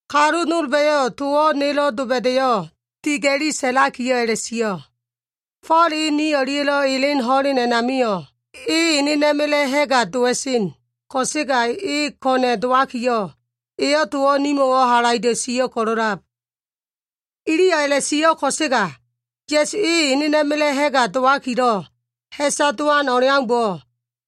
Kalu nolba꞉yo꞉ towo꞉ nelo꞉ doba꞉da꞉yo꞉ diga꞉li sa꞉lakiyo꞉ a꞉la꞉sio꞉, “Fo꞉l e ni o꞉lia꞉lo꞉ elen ho꞉len a꞉namio꞉, e enena꞉ma꞉la꞉ ha꞉ga dowa꞉sen, ko꞉sega e ko꞉na꞉ dowakiyo꞉, eyo꞉ towo꞉ nimo꞉wo꞉ halaido꞉ sio꞉ ko꞉lo꞉lab.” Iliyo꞉ a꞉la꞉sio꞉ ko꞉sega, Ya꞉su e enena꞉ma꞉la꞉ ha꞉ga dowakilo꞉ ha꞉sa dowan o꞉leaumbo꞉,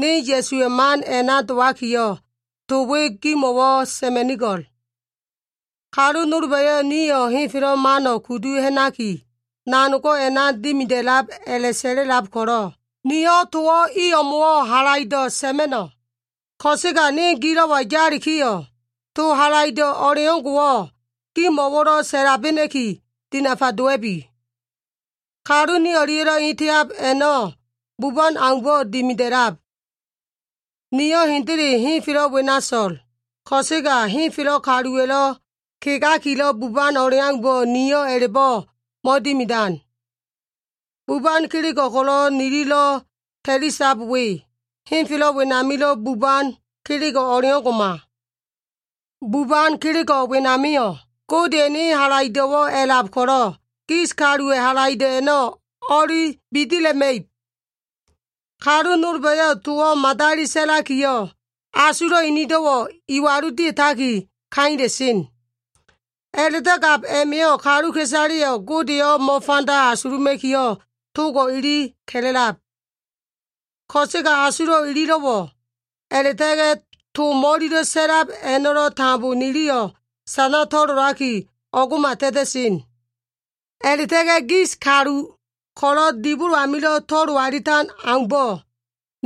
ne Ya꞉suwa꞉ man a꞉na dowakiyo꞉, to we gimo꞉wo꞉ sa꞉ma꞉nigo꞉l. Kalu nolba꞉yo꞉ nio꞉ henfelo꞉ mano꞉ kudu ha꞉naki, nanogo꞉ a꞉na dimida꞉lab a꞉la꞉sa꞉la꞉lab ko꞉lo꞉, niyo꞉ towo꞉ i o꞉mo꞉wo꞉ halaido꞉ sa꞉ma꞉no꞉. Ko꞉sega ne gilo꞉wa yalikiyo꞉, to halaido꞉ o꞉leo꞉ngo꞉wo꞉ gimo꞉wo꞉lo꞉ sa꞉labena꞉ki, dinafa dowa꞉bi. Kalu ne o꞉lia꞉lo꞉ eteab a꞉no꞉ buban aumbo꞉ dimida꞉lab. Nio꞉ hendele henfelo꞉ wena so꞉l, ko꞉sega henfelo꞉ kaluwa꞉lo꞉ kegakilo꞉ buban o꞉leaumbo꞉ nio꞉ a꞉la꞉bo꞉ mo꞉dimidan. Buban kelego꞉ ko꞉lo꞉ nililo꞉ ta꞉lisab we, henfelo꞉ wenamilo꞉ buban kelego꞉ o꞉leo꞉ngo꞉ma. Buban kelego꞉ wenamio꞉, Godeya꞉ ene halaido꞉wo꞉ a꞉lab ko꞉lo꞉, gis kaluwa꞉ halaido꞉ a꞉no꞉ o꞉li bidila꞉ma꞉ib. Kalu nolba꞉yo꞉ towo꞉ madali sa꞉lakiyo꞉, asulo꞉ inido꞉wo꞉ iwalu dia꞉taki kaila꞉sen. A꞉la꞉do꞉ gab a꞉ma꞉yo꞉ kaluka꞉isaleyo꞉ Godeyo꞉ mo꞉fanda asuluma꞉kiyo꞉ togo꞉ ili ka꞉la꞉lab. Ko꞉sega asulo꞉ ililo꞉wo꞉, a꞉la꞉ta꞉ga꞉ to mo꞉lilo꞉ sa꞉lab a꞉no꞉lo꞉ tambo niliyo꞉ sana to꞉lolaki o꞉ngo꞉ma ta꞉ta꞉sen. A꞉la꞉ta꞉ga꞉ gis kalu ko꞉lo꞉ dibolo amilo꞉ to꞉lo alitan aumbo꞉,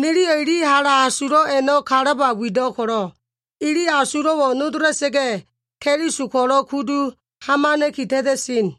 niliyo꞉ ili hala asulo꞉ a꞉no꞉ kalaba wido꞉ ko꞉lo꞉, ili asulo꞉wo꞉ nodola꞉sa꞉ga꞉, Keliso ko꞉lo꞉ kudu hamana꞉ki ta꞉ta꞉sen.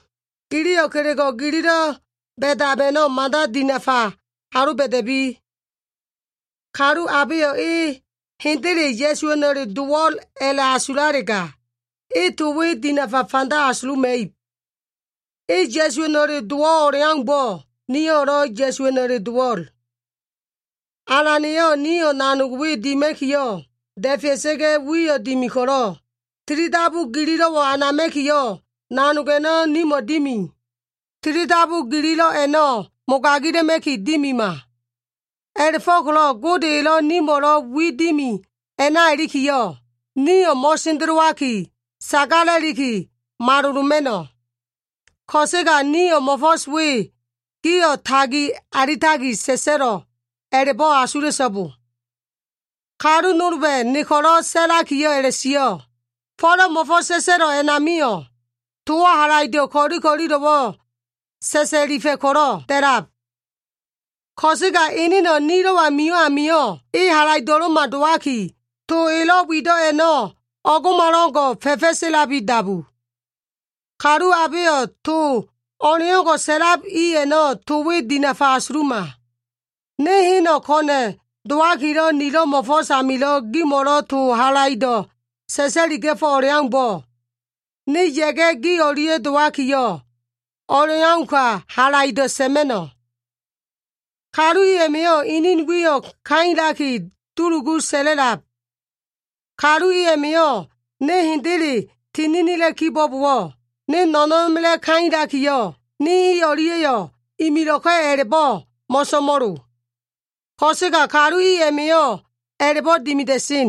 Giliyo꞉ kelego꞉ gililo꞉ ba꞉dab a꞉no꞉ mada dinafa aloba꞉da꞉bi. Kalu abeyo꞉ e hendele Ya꞉suwa꞉no꞉le dowo꞉l a꞉la꞉asulalega, e to we dinafa fanda asuluma꞉ib. E Ya꞉suwa꞉no꞉le dowo꞉ o꞉leaumbo꞉, nio꞉lo꞉ Ya꞉suwa꞉no꞉le dowo꞉l. Alan eyo꞉ nio꞉ nanog we dima꞉kiyo꞉, da꞉fea꞉sa꞉ga꞉ wiyo꞉ dimi ko꞉lo꞉, tilidabu gililo꞉wo꞉ anama꞉kiyo꞉ nanog a꞉no꞉ nimo꞉ dimi. Tilidabu gililo꞉ a꞉no꞉ mogagila꞉ma꞉ki dimima. A꞉la꞉fo꞉ko꞉lo꞉ Gode elo꞉ nimo꞉lo꞉ wi dimi a꞉na ilikiyo꞉, niyo꞉ mo꞉sendelowaki, sagala꞉liki maloloma꞉no꞉. Ko꞉sega niyo꞉ mo꞉fo꞉s we gio꞉ tagi alitaki sa꞉sa꞉lo꞉ a꞉la꞉bo꞉ asula꞉so꞉bo. Kalu nolba꞉yo꞉ ne ko꞉lo꞉ sa꞉lakiyo꞉ a꞉la꞉sio꞉, “Fo꞉la꞉ mo꞉fo꞉s sa꞉sa꞉lo꞉ a꞉namio꞉, towo꞉ halaido꞉ ko꞉li ko꞉lilo꞉wo꞉ sa꞉sa꞉lifa꞉ ko꞉lo꞉ da꞉lab. Ko꞉sega eneno꞉ nilo꞉wa mio꞉ amio꞉, e halaido꞉lo꞉ma dowaki, to elo꞉ wido꞉ a꞉no꞉ o꞉ngo꞉malo꞉ngo꞉, fa꞉fa꞉selabi dabu.” Kalu abeyo꞉ to o꞉leo꞉ngo꞉lo꞉ sa꞉lab i a꞉no꞉ to we dinafa asuluma. Ne heno꞉ ko꞉na꞉ dowakilo꞉ nilo꞉ mo꞉fo꞉s amilo꞉ gimo꞉lo꞉ to halaido꞉ sa꞉sa꞉liga꞉fo꞉ o꞉leaumbo꞉, ne ya꞉ga꞉ gi o꞉lia꞉ dowakiyo꞉, o꞉leauka halaido꞉ sa꞉ma꞉no꞉. Kalu i a꞉ma꞉yo꞉ inin wiyo꞉ kailaki dulugu sa꞉la꞉lab. Kalu i a꞉ma꞉yo꞉ ne hendele tininila꞉ kibo꞉bowo꞉, ne no꞉no꞉na꞉ma꞉la꞉ kailakiyo꞉, ne i o꞉lia꞉yo꞉ imilo꞉ka꞉ a꞉la꞉bo꞉ mo꞉so꞉mo꞉lo. Ko꞉sega kalu i a꞉ma꞉yo꞉ a꞉la꞉bo꞉ dimida꞉sen.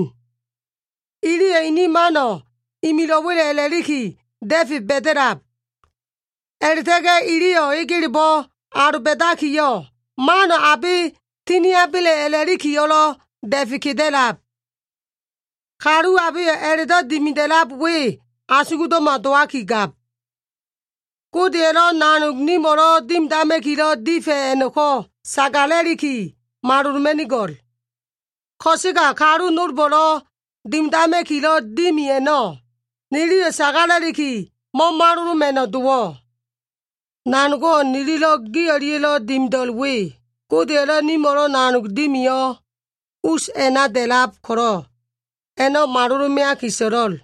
Iliyo꞉ ini mano꞉ imilo꞉wa꞉le a꞉la꞉liki da꞉fe ba꞉da꞉lab. A꞉la꞉ta꞉ga꞉ iliyo꞉ egelebo꞉ aloba꞉dakiyo꞉, mano꞉ abe tiniaba꞉le a꞉la꞉likiyo꞉lo꞉ da꞉fe keda꞉lab. Kalu abeyo꞉ a꞉la꞉do꞉ dimida꞉lab we asugdo꞉ma dowaki gab. Godeya꞉lo꞉ nanogo꞉ nimo꞉lo꞉ dimidama꞉kilo꞉ difa꞉ a꞉no꞉ko꞉ sagala꞉liki maloloma꞉nigo꞉l. Ko꞉sega kalu nolbo꞉lo꞉ dimidama꞉kilo꞉ dimi a꞉no꞉, niliyo꞉ sagala꞉liki mo꞉maloloma꞉no꞉ dowo꞉. Nanogo꞉ nililo꞉ gi o꞉lia꞉lo꞉ dimida꞉lo꞉l we, Godeya꞉lo꞉ nimo꞉lo꞉ nanog dimiyo꞉ us a꞉na da꞉lab ko꞉lo꞉, a꞉no꞉ malolo꞉ meaki so꞉lo꞉l.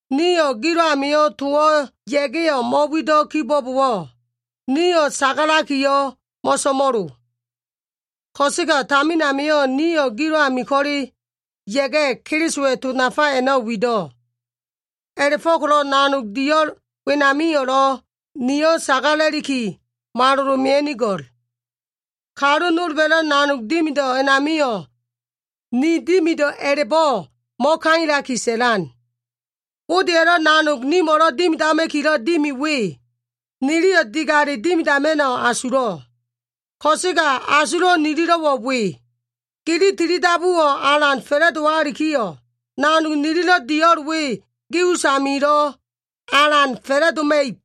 Nio꞉ gilo꞉ amio꞉ ya꞉ga꞉yo꞉ towo꞉ mo꞉wido꞉ kibo꞉bowo꞉, nio꞉ sagala꞉likiyo꞉ mo꞉so꞉mo꞉lo. Ko꞉sega tamin amio꞉ nio꞉ gilo꞉ ami ko꞉le ya꞉ga꞉, Kelisowa꞉ to nafa a꞉no꞉ wido꞉. A꞉la꞉fo꞉ko꞉lo꞉ nanog dio꞉l wenamio꞉lo꞉ nio꞉ sagala꞉liki malolo꞉ mea꞉nigo꞉l. Kalu nolba꞉lo꞉ nanog dimido꞉ a꞉namio꞉ ni dimido꞉ a꞉la꞉bo꞉ mo꞉kailaki sa꞉lan. Godeya꞉lo꞉ nanog nimo꞉lo꞉ dimidama꞉kilo꞉ dimi we, niliyo꞉ digale dimidama꞉no꞉ asulo꞉. Ko꞉sega asulo꞉ nililo꞉wo꞉ we. Gili tilidabuwo꞉ alan fa꞉la꞉dowalikiyo꞉, nanog nililo꞉ dio꞉l we gi usamio꞉lo꞉ alan fa꞉la꞉doma꞉ib.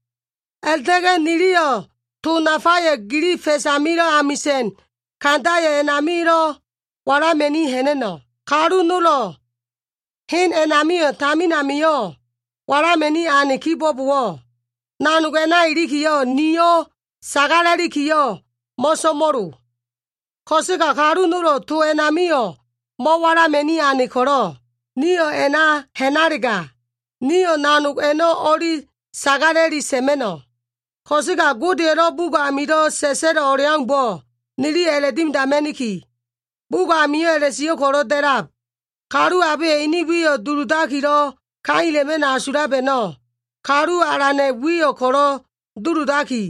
A꞉la꞉ta꞉ga꞉ niliyo꞉ to nafayo꞉ gili fa꞉s amilo꞉ amisa꞉n kandayo꞉ a꞉namio꞉lo꞉ walama꞉ni ha꞉na꞉no꞉. Kalu nolo꞉ hen a꞉namio꞉ tamin amio꞉ walama꞉ni ane kibo꞉bowo꞉, nanog a꞉na ilikiyo꞉ nio꞉ sagala꞉likiyo꞉ mo꞉so꞉mo꞉lo. Ko꞉sega kalu nolo꞉ towo꞉ a꞉namio꞉ mo꞉walama꞉ni ane ko꞉lo꞉, nio꞉ a꞉na ha꞉nalega, niyo꞉ nanog a꞉no꞉ o꞉li sagala꞉li sa꞉ma꞉no꞉. Ko꞉sega Godeya꞉lo꞉ bugo꞉ amilo꞉ sa꞉sa꞉lo꞉ o꞉leaumbo꞉, niliyo꞉ a꞉la꞉dimidama꞉niki. Bugo꞉ amio꞉ a꞉la꞉sio꞉ ko꞉lo꞉ da꞉lab, “Kalu abeyo꞉ ene wiyo꞉ duludakilo꞉ ka꞉ila꞉ma꞉no꞉ asulab a꞉no꞉, Kalu Alana꞉ wiyo꞉ ko꞉lo꞉ duludaki,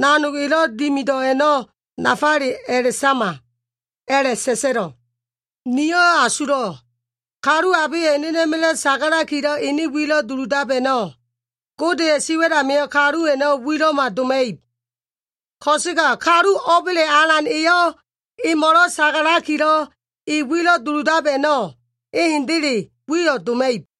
nanog elo꞉ dimido꞉ a꞉no꞉ nafale a꞉la꞉sama,” a꞉la꞉sa꞉sa꞉lo꞉. Nio꞉ asulo꞉. Kalu abeyo꞉ enena꞉ma꞉la꞉ sagalakilo꞉ ene wilo꞉ duludab a꞉no꞉, Godeya꞉ siwa꞉l amio꞉ kalu a꞉no꞉ wilo꞉ma doma꞉ib. Ko꞉sega kalu o꞉ba꞉le Alan eyo꞉ emo꞉lo꞉ sagalakilo꞉ e wilo꞉ duludab a꞉no꞉, e hendele wiyo꞉ doma꞉ib.